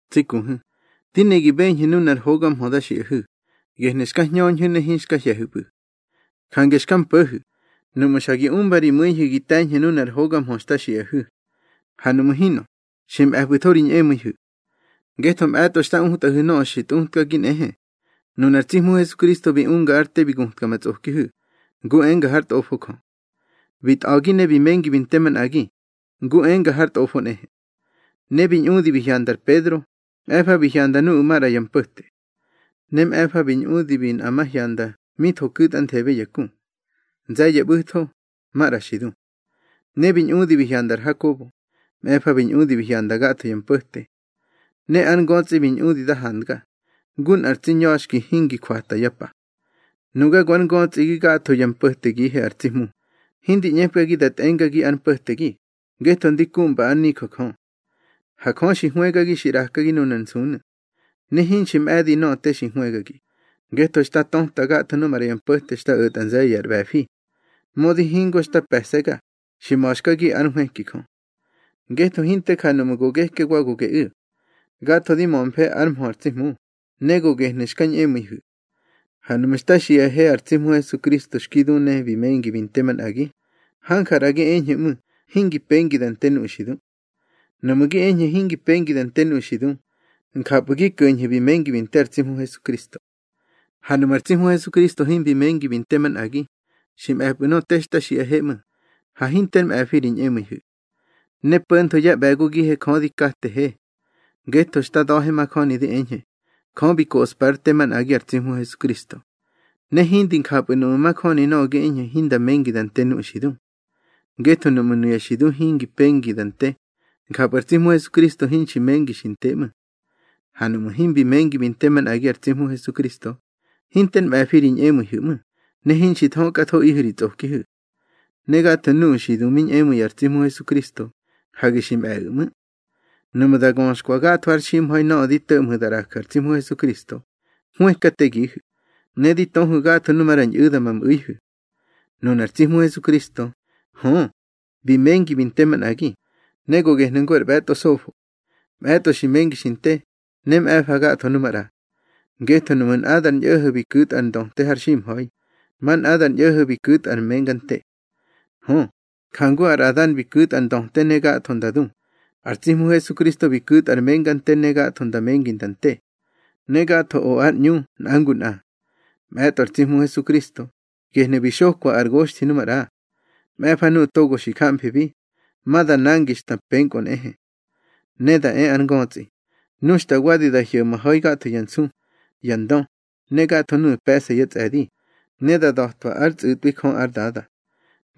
Tsi kuhu̱, di ne gi beñhu̱ nunar hoga mhö da xiꞌahu̱, gehnu̱ xka hñöñhu̱ ne hinxka hye̱hu̱pꞌu̱. Jange xka mpo̱hu̱, nuꞌmu̱ xa gi umba ri mu̱ihu̱ gi te̱ñhu̱ nunar hoga mhö xta xiꞌahu̱. Ha nuꞌmu̱ hinꞌö, xi mꞌe̱pꞌu̱tho ri ñꞌemu̱ihu̱. Ngetho mꞌe̱tꞌo xta utꞌahu̱ nöꞌö xi tꞌutkagi nꞌehe: Nunar tsi Hmu Hesukristo bi unga ár te bi gutka ma tsꞌokihu̱, ngu enga hár Tꞌofo Jö. Bi tꞌa̱gi ne bi mengi bi nte manꞌagi, ngu enga har Tꞌofo nꞌehe. Ne bi ñꞌudi bi hyanda ar Pedro, mꞌe̱fa bi hyanda nuꞌu̱ maꞌra yá mpo̱te. Ne mꞌe̱fa bi ñꞌudi bi nꞌamahyanda mi tho ku̱tꞌanthebe ya ku. Nze̱ye̱ ꞌbu̱tho, maꞌra xi du. Ne bi ñꞌudi bi hyanda ar Hakobo, mꞌe̱fa bi ñꞌudi bi hyanda gatho ya mpo̱te. Ne ár ngötsꞌi bi ñꞌudi da handga, ngu nꞌar tsi ña̱xki hingi jwata yá pa. Nuga go ár ngötsꞌigi gatho yá mpo̱tegihe ar tsi Hmu. Hindi ꞌñepkagi da tꞌengagi ár mpo̱tegi, ngetho ndi kumba ár nijö Jö. Ha Jö xi hwëgagi xi ꞌraka nunar nsunu̱. Ne hinxi mꞌe̱di nöꞌö te xi hwëgagi, ngetho xta töta gatho nu maꞌra ya mpo̱te xta o̱tꞌa nze̱ye̱ ar ꞌbe̱fi. Mödi hingo xta pe̱se̱ga, xi ma̱xkagi ár nhwëki Jö. Ngetho hinte ja nuꞌmu̱ go geke wa go geꞌu̱. Gatho di mömfe ár mhö ar tsi Hmu, ne go gehnu̱ xka ñꞌemu̱ihu̱. Ha nuꞌmu̱ xta xiꞌahe ar tsi Hmu Hesukristo xki du ne bi mengi bi nte manꞌagi, hanja ꞌra gi eñhu̱ ꞌmu̱ hingi pengi da nte nuꞌu̱ xi du. Nuꞌmu̱ gi eñhu̱ hingi pengi da nte nuꞌu̱ xi du, njapꞌu̱ gi ko̱ñhu̱ bi mengi bi nte ar tsi Hmu Hesukristo. Ha nuꞌmu̱ ar tsi Hmu Hesukristo himbi mengi bi nte manꞌagi, xi mꞌe̱pꞌu̱ nöꞌö te xta xiꞌahe ꞌmu̱, ne hinter me̱ꞌö ri ñꞌemu̱ihu̱. Ne po̱ntho yá ꞌbe̱gogihe Jö di katehe. Ngetho xta da̱he majöni di eñhe, Jö bi koꞌspa ár te manꞌagi ar tsi Hmu Hesukristo. Ne hindi njapꞌu̱ nuꞌmu̱ majöni nöꞌö gi eñhu̱ hinda mengi da nte nuꞌu̱ xi du. Ngetho nuꞌmu̱ nuya xi du hingi pengi da nte, njapꞌu̱ ar tsi Hmu Hesukristo hinxi mengi xi nte ꞌmu̱. Ha nuꞌmu̱ himbi mengi bi nte manꞌagi ar tsi Hmu Hesukristo, hinter mꞌe̱fi ri ñꞌemu̱ihu̱ ꞌmu̱, ne hinxi thökꞌathoꞌihu̱ ri tsꞌokihu̱. Ne gatho nuꞌu̱ xi du mi ñꞌemu̱i ar tsi Hmu Hesukristo, hage xi mꞌe̱ꞌu̱ ꞌmu̱. Nuꞌmu̱ da göxkwa gatho har ximha̱i nöꞌö di to̱ꞌmhu̱ da ꞌraju̱ ar tsi Hmu Hesukristo, hwëkategihu̱, ne di töhu̱ gatho nu maꞌra ñꞌu̱da ma mꞌu̱ihu̱. Nunar tsi Hmu Hesukristo, hö, bi mengi bi nte manꞌagi, ne go gehnu̱ ngu ar ꞌbe̱tꞌo sofo. Mꞌe̱tꞌo xi mengi xi nte, ne mꞌe̱fa gatho nu maꞌra. Ngetho nuꞌmu̱ nꞌadar ñꞌo̱ho̱ bi ku̱tꞌa ar ndöte har ximha̱i, ma nꞌadar ñꞌo̱ho̱ bi ku̱tꞌa ar menga nte. Hö, njangu ar Adan bi ku̱tꞌa ar ndöte ne gatho nda du, ar tsi Hmu Hesukristo bi ku̱tꞌa ar menga nte ne gatho nda mengi nda te. Ne gatho o ár ꞌñu nꞌa ngu nꞌa. Mꞌe̱tꞌo ar tsi Hmu Hesukristo, gehnu̱ bi xokwa ar goxthi nu maꞌra. Mꞌe̱fa nuꞌu̱ togo xi jamfibi, ma da nangi xta penkꞌö nꞌehe. Ne da e ar ngötsꞌi, nu xta wadi da hyo̱maha̱i gatho ya nsu, ya ndö, ne gatho nuꞌu̱ pe̱ꞌsa yá tsꞌe̱di, ne da da̱twa ár tsꞌu̱tꞌwi Jö ár Dada.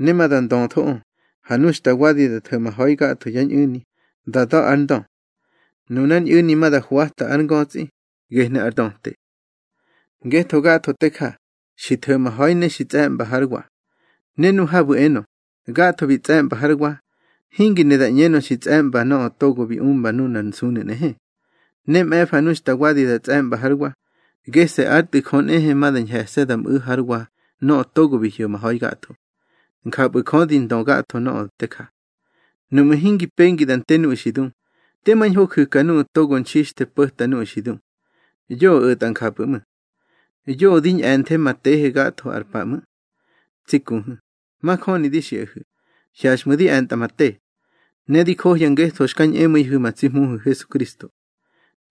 Ne ma da ndöthoꞌö, ha nu xta wadi da tho̱maha̱i gatho yá ñꞌu̱ni, da da̱ ar ndö. Nunár ñꞌu̱ni ma da hwata ár ngötsꞌi, gehnu̱ ar ndöte. Ngetho gatho te ja, xi tho̱maha̱i ne xi tsꞌe̱ꞌmba hár wa. Ne nu habu̱ enö, gatho bi tsꞌe̱ꞌmba hár wa, hingi ne da ꞌñenö xi tsꞌe̱ꞌmba nöꞌö togo bi umba nunar nsunu̱ nꞌehe. Ne mꞌe̱fa nu xta wadi da tsꞌe̱ꞌmba hár wa, gese̱ ár Tꞌu̱ Jö nꞌehe ma da ñhe̱se̱ da mꞌu̱ hár wa nöꞌö togo bi hyo̱maha̱i gatho. Njapꞌu̱ Jö di ndö gatho nöꞌö te ja. Nuꞌmu̱ hingi pengi da nte nuꞌu̱ xi du, tema ñho ju̱ka nuꞌu̱ togo nxixthe po̱ta nuꞌu̱ xi du. Yoꞌö o̱tꞌa njapꞌu̱ ꞌmu̱. Yoꞌö di ñꞌe̱nthe ma tehe gatho ar pa ꞌmu̱. Tsi kuhu̱, majöni di xiꞌahu̱, hyaxꞌmu̱ di e̱ntꞌa ma te. Ne di johya ngetho xka ñꞌemu̱ihu̱ ma tsi Hmuhu̱ Hesukristo.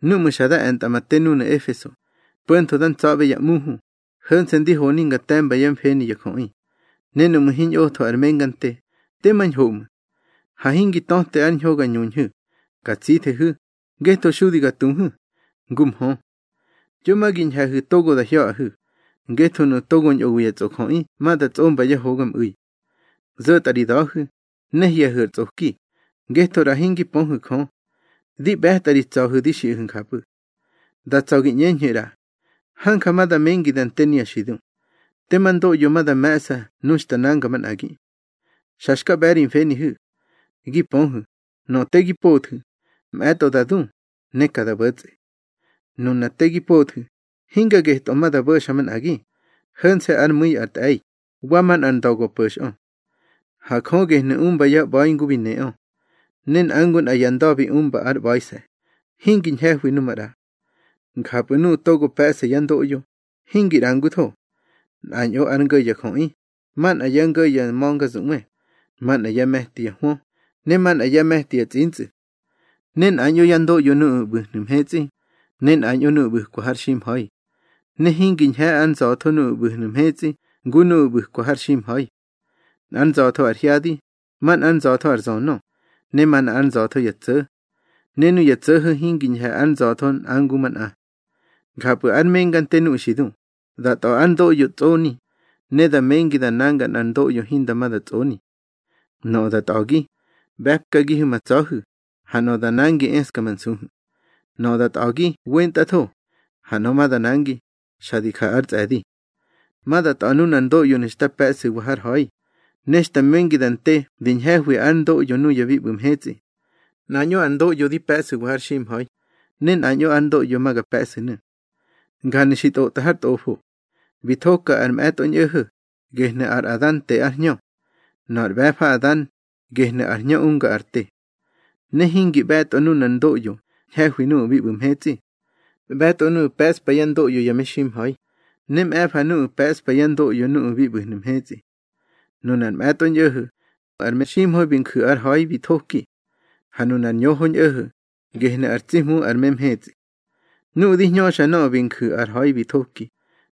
Núꞌmu̱ xa da e̱ntꞌa ma te núnu̱ Efeso, po̱ntho da ntsa̱ꞌbe ya ꞌmuhu, ho̱nse̱ ndi honi nga te̱mba yá mfeni ya jöꞌi, ne nuꞌmu̱ hiñꞌotho ar menga nte, tema ñho ꞌmu̱. Ha hingi töte ár ñho ga ñuñhu̱, ga tsithehu̱, ngetho xudi ga tuhu̱, ngu mhö. Yo ma gi ñhe̱hu̱ togo da hya̱ꞌahu̱, ngetho nuꞌu̱ togo ñꞌowi ya tsꞌojöꞌi ma da tsꞌomba yá hogamꞌu̱i. Zo̱tꞌa ri da̱hu̱, ne hye̱hu̱ ar tsꞌoki, ngetho ꞌra hingi pöhu̱ Jö. Di ꞌbe̱tꞌa ri tsa̱hu̱ di xiꞌahu̱ njapꞌu̱. Da tsa̱ gi ꞌñeñhu̱ ꞌra: Hanja ma da mengi da nte nuya xi du. Tema ndoꞌyo ma da me̱ꞌsa nu xta nanga manꞌagi. Xa xka ꞌbe̱ ri mfenihu̱. Gi pöhu̱, nöꞌö te gi pothu̱, mꞌe̱tꞌo da du, ne ka da bo̱tsꞌe. Nuna te gi pothu̱, hinga getꞌö ma da bo̱xa manꞌagi, ho̱nse̱ ár mu̱i ar tꞌe̱i, wa manꞌar nda̱ go po̱xꞌö. Ha Jö gehnu̱ umba yá ꞌba̱i ngu bi neꞌö. Ne nꞌa ngu nꞌa ya nda̱ bi umba ár ꞌba̱ise̱, hingi ñhe̱hwi nu maꞌra. Njapꞌu̱ nuꞌu̱ togo pe̱ꞌsa yá ndoꞌyo, hingi ꞌrangutho. Nꞌañꞌo ár ngo̱ ya jöꞌi, manꞌa yá ngo̱ ya ma̱ngazuꞌwe; manꞌa yá me̱ti ya hwö, ne manꞌa yá me̱ti ya tsꞌintsꞌu̱. Ne nꞌañꞌo yá ndoꞌyo nuꞌu̱ ꞌbu̱hnu̱ mhetsꞌi, ne nꞌañꞌo nuꞌu̱ ꞌbu̱kwa har ximha̱i. Ne hingi ñhe̱ ár nza̱tho nuꞌu̱ ꞌbu̱hnu̱ mhetsꞌi ngu nuꞌu̱ ꞌbu̱kwa har ximha̱i. Nꞌár nza̱tho ar hyadi, manꞌár nza̱tho ar zönö, ne manꞌa ár nza̱tho ya tso̱. Ne nuya tso̱ho̱ hingi ñhe̱ ár nza̱tho nꞌa ngu manꞌa. Njapꞌu̱ ár menga nte nuꞌu̱ xi du, da tꞌa̱ ár ndoꞌyo tsꞌoni, ne da mengi da nanga nꞌar ndoꞌyo hinda ma da tsꞌoni. Nöꞌö da tꞌa̱gi, ꞌbe̱pkagihu̱ ma tsa̱hu̱, ha nöꞌö da nangi eska ma nsuhu̱. Nöꞌö da tꞌa̱gi wentꞌatho, ha nöꞌö ma da nangi, xa di ja ár tsꞌe̱di. Ma da tꞌa̱ nunar ndoꞌyonu̱ xta pe̱ꞌsu̱wa har ha̱i, ne xta mengi da nte di ñhe̱hwi ár ndoꞌyo nuya bi ꞌbu̱ mhetsꞌi. Nꞌañꞌo ar ndoꞌyo di pe̱ꞌsu̱wa har ximha̱i, ne nꞌañꞌo ar ndoꞌyo ma ga pe̱ꞌsu̱nu̱. Njanu̱ xi ntꞌotꞌa har Tꞌofo: Bi thoka ar mꞌe̱tꞌo ñꞌo̱ho̱, gehnu̱ ar Adan te ár hñö. Nöꞌö ar ꞌbe̱fa Adan, gehnu̱ ar Hñö unga ar te. Ne hingi ꞌbe̱tꞌo nunar ndoꞌyo ñhe̱hwi nuꞌu̱ bi ꞌbu̱ mhetsꞌi. ꞌBe̱tꞌo nuꞌu̱ pe̱ꞌspa yá ndoꞌyo ya meximha̱i, ne mꞌe̱fa nuꞌu̱ pe̱ꞌspa yá ndoꞌyo nuꞌu̱ bi ꞌbu̱hnu̱ mhetsꞌi. Nunar mꞌe̱tꞌo ñꞌo̱ho̱, ar meximha̱i bi nju̱ ar ha̱i bi thoki. Ha nunar ñoho ñꞌo̱ho̱, gehnu̱ ar tsi Hmu ar memhetsꞌi. Nuꞌu̱ di hñöxa nöꞌö bi nju̱ ar ha̱i bi thoki,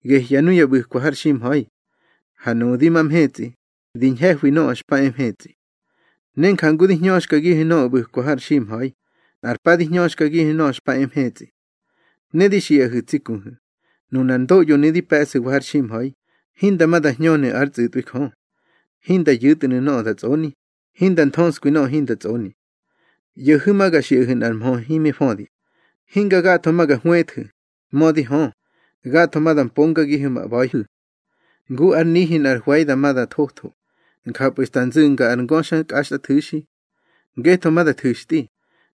gehya nuya ꞌbu̱kwa har ximha̱i. Ha nuꞌu̱ di ma mhetsꞌi, di ñhe̱hwi nöꞌö xpa e mhetsꞌi. Ne jangu di hñöxkagihu̱ nöꞌö ꞌbu̱kwa har ximha̱i, nꞌar pa di hñöxkagihu̱ nöꞌö xpa e mhetsꞌi. Ne di xiꞌahu̱ tsi kuhu̱, nunar ndoꞌyonu̱ di pe̱ꞌsu̱wa har ximha̱i, hinda ma da hñönu̱ ár tsꞌu̱tꞌwi Jö. Hinda yu̱tnu̱ nöꞌö da tsꞌoni, hinda nthöskwi nöꞌö hinda tsꞌoni. ꞌYo̱hu̱ ma ga xiꞌahu̱ nꞌar mhö himi födi: Hinga gatho ma ga hwëthu̱, mödi hö, gatho ma da mpongagihu̱ ma ꞌba̱ihu̱. Ngu ár nihi nꞌar hwe̱i dama da thotho, njapꞌu̱ xta nzu̱nga ar ngöxa kꞌaxtꞌathu̱xi. Ngetho ma da thu̱xtꞌi,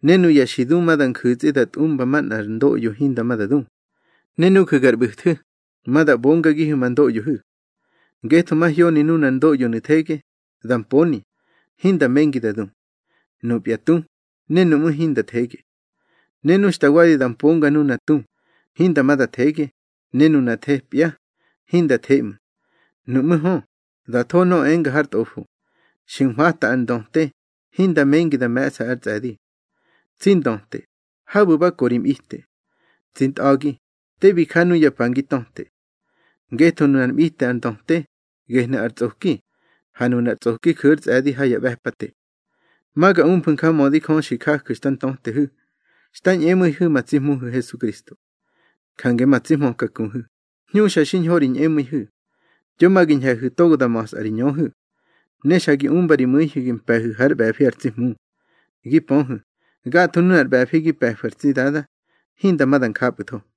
ne nuya xi du ma da nju̱tsꞌi da tꞌumba manꞌar ndoꞌyo hinda ma da du. Ne nuju̱ gar ꞌbu̱thu̱, ma da ꞌbongagihu̱ ma ndoꞌyohu̱. Ngetho mahyoni nunar ndoꞌyonu̱ thege, da mponi, hinda mengi da du. Nupya tu, ne nuꞌmú̱, hinda thege. Ne nu xta wadi da mponga nuna tu, hinda ma da thege, ne nuna thepya, hinda the ꞌmu̱. Nuꞌmú̱ hö, da tho nöꞌö enga har Tꞌofo: Xi nhwata ar ndöte, hinda mengi da me̱ꞌsa ár tsꞌe̱di. Tsi ndöte, habu̱ ba ko ri mꞌite. Tsi ntꞌa̱gi, te bi ja nuya pa ngi töte. Ngetho nunár mꞌite ar ndöte, gehnu̱ ar tsꞌoki, ha nunar tsꞌoki ju̱ ár tsꞌe̱di ha ya ꞌbe̱pate. Ma ga umfu̱ njamödi Jö xi jaju̱ xta ntötehu̱ xta ñꞌemu̱ihu̱ ma tsi Hmuhu̱ Hesukristo. Jange ma tsi hmöka kuhu̱, hñuxa xiñho ri ñꞌemu̱ihu̱. Yo ma gi ñhe̱hu̱ togo da ma̱sꞌa ri ñöhu̱. Ne xa gi umba ri mu̱ihu̱ gi mpe̱hu̱ hár ꞌbe̱fi ar tsi Hmu. Gi pöhu̱, gatho nunar ꞌbe̱fi gi pe̱fu̱ ar tsi Dada, hinda ma da njapꞌu̱tho.